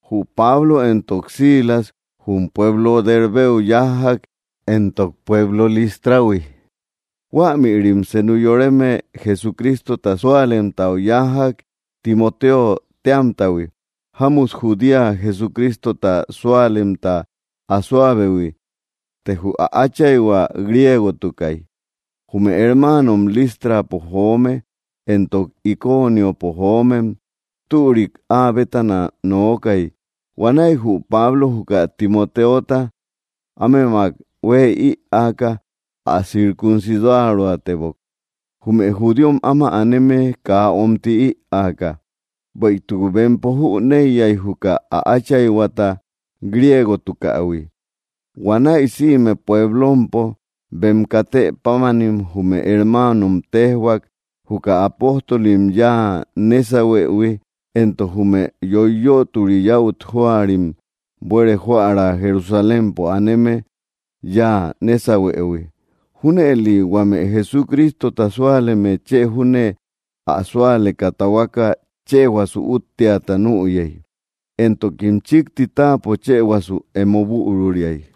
Jü Pablo éntok Silas jum pueblo Dérbeu yájjak éntok pueblo Lístrahui. Huämïrim senu yoreme Jesucrístota súalemtau yájjak Timotéo téamtahui, jámmut judía Jesucrístota súalemta asóabehui, të jü ä áchaihua griégotukai. Jume hermáanom Listrapo joome éntok Iconiopo joomem türik áa bétana nookay. Huanäi jü Pablo juka Timoteota ámemak huë ïaaka ä circuncidaroatebok, jume judíom áma aneme kaa omtï ïaaka, bueïtuk bempo jüneiyay, juka ä áchaihuata griegotukähui. Huanäi sïme puéblompo bem katë pámanim jume hermáanom téjhuak juka apóstolim yáa nésahuëhui éntok jume yoiyötori yäut jóarim buere joära Jerusalémpo aneme yáa nésahuëhui. Júnëli huame Jesucrístota súaleme chë júne ä súaleka tahuaka chëhuasu útteata nüyei, éntokim chikti táapo chëhuasu emo büruriai.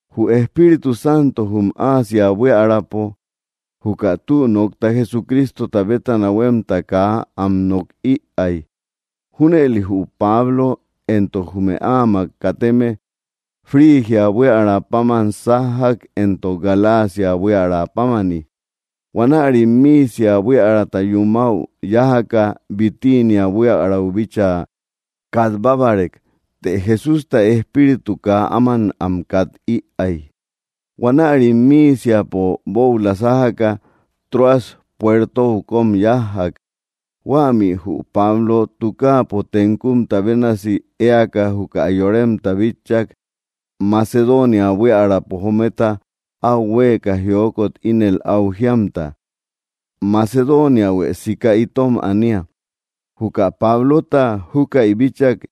Jü Espíritu Santo jum Asia buíaräpo juka tü nokta Jesucrístota bétana huemta kaa am nok ïay. Júnëli jü Pablo éntok jume áamak kateme Frigia buiära páman sájjak éntok Galacia buiärapámani. Huanärim Misia buiärata yumäu yájaka Bitíniä buiärau bíchaa katbábarek, të Jesústa Espíritu kaa áman am kat-ïay. Huanärim Míisiapo bóula sájaka, Troas puertou kom yájjak. Huämi jü Pablo tukáapo tenkumta bénasi éaka juka yoremta bitchak Macedónia buíaräpo jometa au huéeka jiókot ínel au jíamta: “Macedooniahuë siká itom anía.” Juka Pablota júkäi bíchak,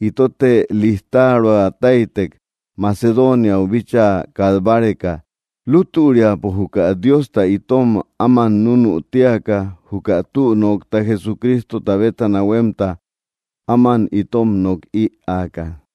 itote lijtaroa táytek, Macedooniau bíchaa kat báreka, lútüriapo juka Diosta itom áman núnü tíaka juka tü nokta Jesucrístota bétana huemta áman itom nok ïaaka.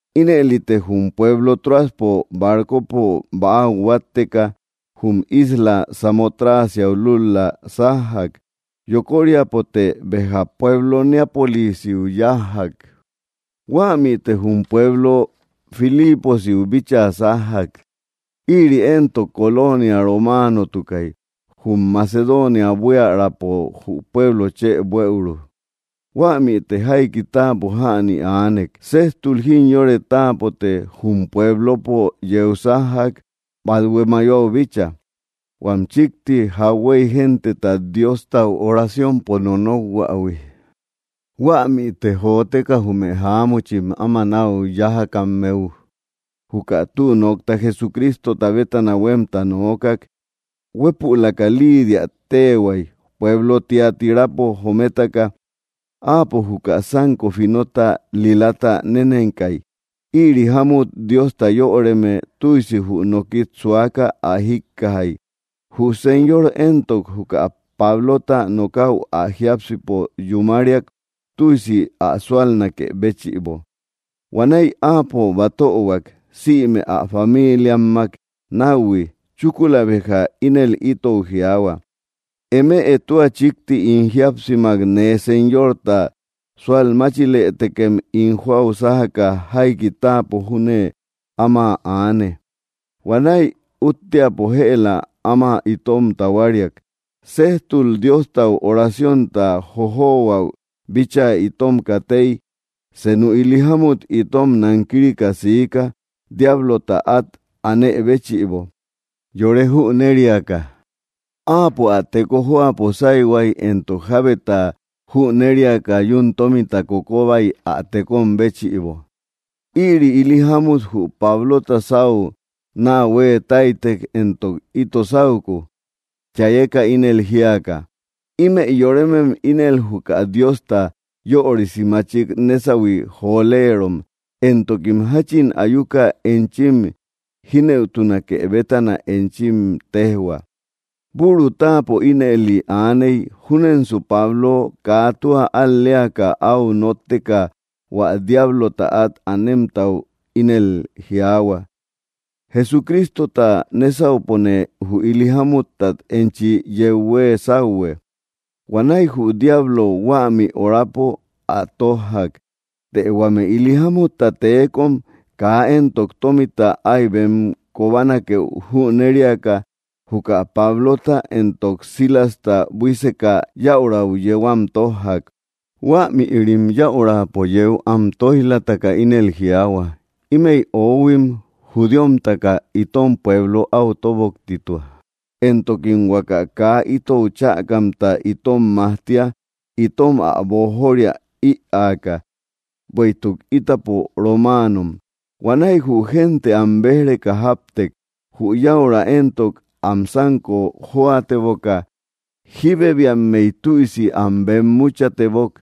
Ínëlite jum pueblo Tróaspo barcopo bäau huátteka jum isla Samotracia lúl‑la sájjak. Yokoriapote béja pueblo Neápolisiu yájjak. Huämite jum pueblo Filíposiu bíchaa sájjak. Ïri éntok colonia romáanotukai, jum Macedonia buíaräpo jü pueblo chë buëuru. Huämite jaiki táapo jäni aanek. Séjtul jimyore táapote jum pueblopo yeu sájjak bathué mayoau bícha, huam chikti jakhuéi genteta Diostau oraciompo nonokhuähui. Huämite joteka jume jaámuchim áma nau yájakammeu juka tü nokta Jesucrístota bétana huemta noókak. Huépülaka Lídia téhuaka pueblo Tiatírapo jométaka. Áapo juka sanko finota lilata nénenkai. Ïri jámmut Diosta yöreme tüisi jü nókit suaka ä jíkkajai. Jü Señor éntok, juka Pablota nokäu ä jiápsipo yumáriak tüisi ä suálnakë béchïbo. Huanäi áapo batöhuak sïme ä famíliammak nauhui. Chúkula béja ínel itou jiaahua: —Eme tua chikti ín jíapsimak nee Señorta sualmáchilëtekem ín joau sájaka jaiki táapo júne áma aane. Huanäi útteapo jëla áma itom tahuáriak. Séjtul, Diostau oraciónta jojohuäu bíchaa itom katéi, senu ili jámmut itom nankírika siika diáblota at anë béchïbo yore jünériaka. Áapo ä teko jóapo sáihuai éntok jábeta jünériaka yuun tómita kokobai ä tékom béchïbo. Ïri ili jámmut jü Pablota sáu naa hueetáitek éntok ito sauku, chayeka ínel jíaka: —Ímëi yorémem ínel juka Diosta yörisi máchik nésahui joléerom, éntokim jachin ayuka enchim jínëutunake bétana enchim tejhua. Büru táapo ínëli aaney, júnensu Pablo kaa tua al‑léaka, au nótteka hua diáblota at anemtau ínel jiaahua: —Jesucrístota nésaupone jü ili jámutat enchi yeu huee sauhue. Huanäi jü diablo huämi orapo áa tójjak. Të huame ili jámutta tékom kaa éntok tómita ái bem kóbanakeu jünériaka, juka Pablota éntok Silasta buíseka yäurau yéu am tójjak. Huämïrim yäurapo yéu am tóij‑lataka ínel jiaahua: —Ímëi oóhuim judíomtaka itom pueblo au tóboktitua, éntokim huaka kaa itou chäkamta itom majtía itom ä boojoria ïaaka, bueïtuk ítapo romaanom. Huanäi jü génte am béj‑reka jáptek. Jü yäura éntok, am sanko joateboka jibebiammey tüisi am bemmuchatebok.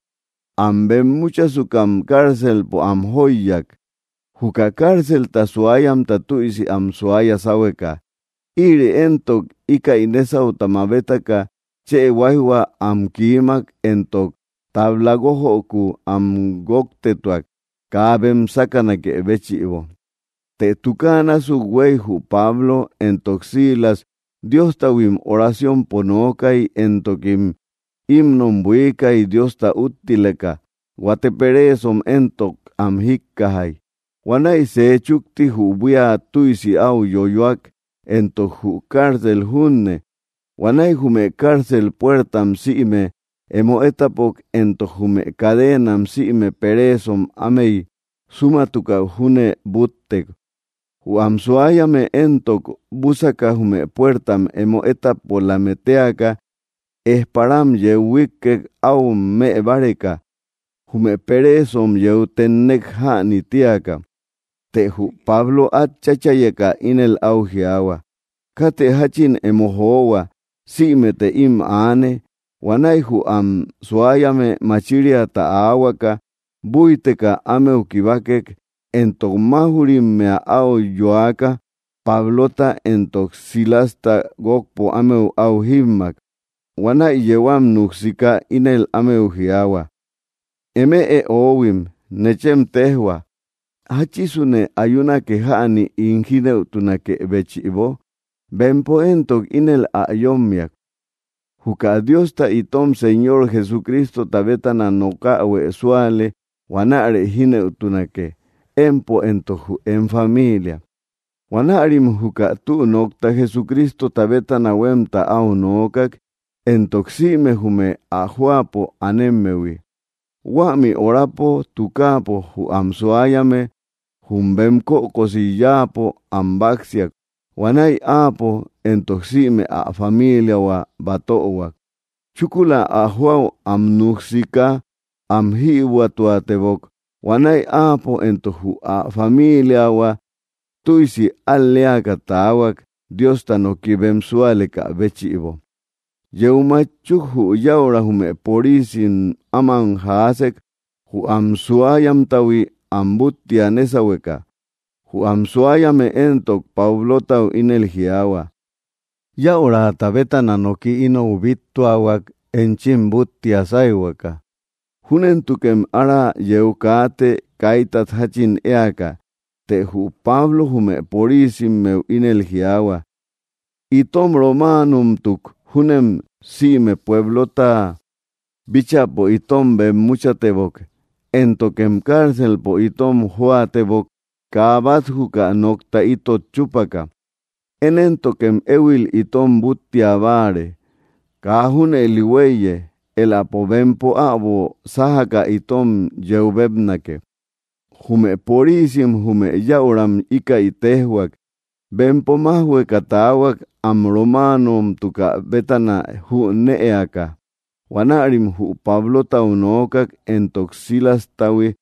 Am bemmuchasukam cárcelpo am jóiyak, juka cárcelta suáyamta tüisi am suaya sáhueka. Ïri éntok íkäi nésauta mabétaka chë huáijhua am kiímak éntok tabla guójöku am guóktetuak, kaa bem sákanakë béchïbo. Të tukáa násuk huei jü Pablo éntok Silas Dióstahuim oraciompo nookai, éntokim hímnom buiikai Diosta úttileka, huate pereesom éntok, am jikkajai. Huanäi sej chukti jü buía tüisi áu yoyoak, éntok jü cárcel junne. Huanäi jume cárcel puertam sïme emo étapok éntok jume cadeenam sïme pereesom ámey súmatukau júne búttek. Jü am suáyame éntok, búsaka jume puértam emo étapolame téaka, ejparam yeu huíkkek au mëbáreka, jume peréesom yeu ténnek jäni tíaka. Të jü Pablo at cháchayeka ínel au jiaahua: —Kátë jachin emo johua. Sïmete ím aane. Huanäi jü am suáyame machíriata aáhuaka, búiteka ámeu kibákek, éntok máuj‑rimmea au yoaka Pablota éntok Silasta guokpo ámeu au jímmak. Huanäi yéu am nuksiká ínel ámeu jiaahua: —Eme oóhuim, nechem tejhua, ¿jáchisune ayúnake jäni ín jínëutunakë béchïbo? Bempo éntok ínel ä yómmiak: —Juka Diosta itom Señor Jesucrístota bétana nokähuë súale, huanäre jínëutunake, empo éntok jü em familia. Huanärim juka tü nokta Jesucrístota bétana huemta au noókak éntok sïme jume ä jóapo anémmehui. Huämi orapo tukáapo jü am suáyame jum bem kökosi yáapo am báksiak. Huanäi áapo éntok sïme ä famíliahua batöhuak. Chúkula ä joau am nuksiká am jïbuätuatebok. Huanäi áapo éntok jü ä famíliahua tüisi al‑léaka taahuak Diosta noki bem súalekä béchïbo. Yeu matchuk jü yäura jume porisim áman jaásek jü am, suáyamtahui am búttia nésahueka. Jü am suáyame éntok, Pablotau ínel jiaahua: —Yäurata bétana noki inou bíttuahuak enchim búttia sáihuaka. Júnentukem ára yeu kaate kaítat jachin éaka. Të jü Pablo jume porisimmeu ínel jiaahua: —Itom románomtuk júnem sïme puéblota bíchäpo itom bemmúchatebok, éntokem cárcelpo itom jóatebok kaa bat juka nokta itot chúpaka. ¿Én éntokem éhuil itom búttia báare? Kaa junëli huéiye. Éläpo bempo äbo sájaka itom yeu bébnake. Jume porícim jume yäuram íkäi téjhuak, bempo májhueka taahuak am románomtukä bétana jünëaka. Huanärim jü Pablotau noókak éntok Silástahui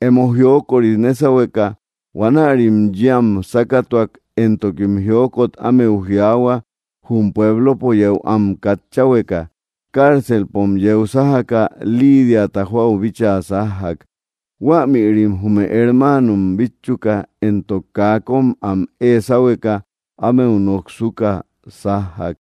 emo jiókori nésahueka. Huanärim yéu am sákatuak, éntokim jiókot ámeu jiaahua jum puéblopo yéu am katcháhueka. Cárcelpom yeu sájaka Lídiata joau bíchaa sájjak. Huanärim jume hermáanom bítchuka éntok kaa köm am ée sáhueka ámeu noksuka sájjak.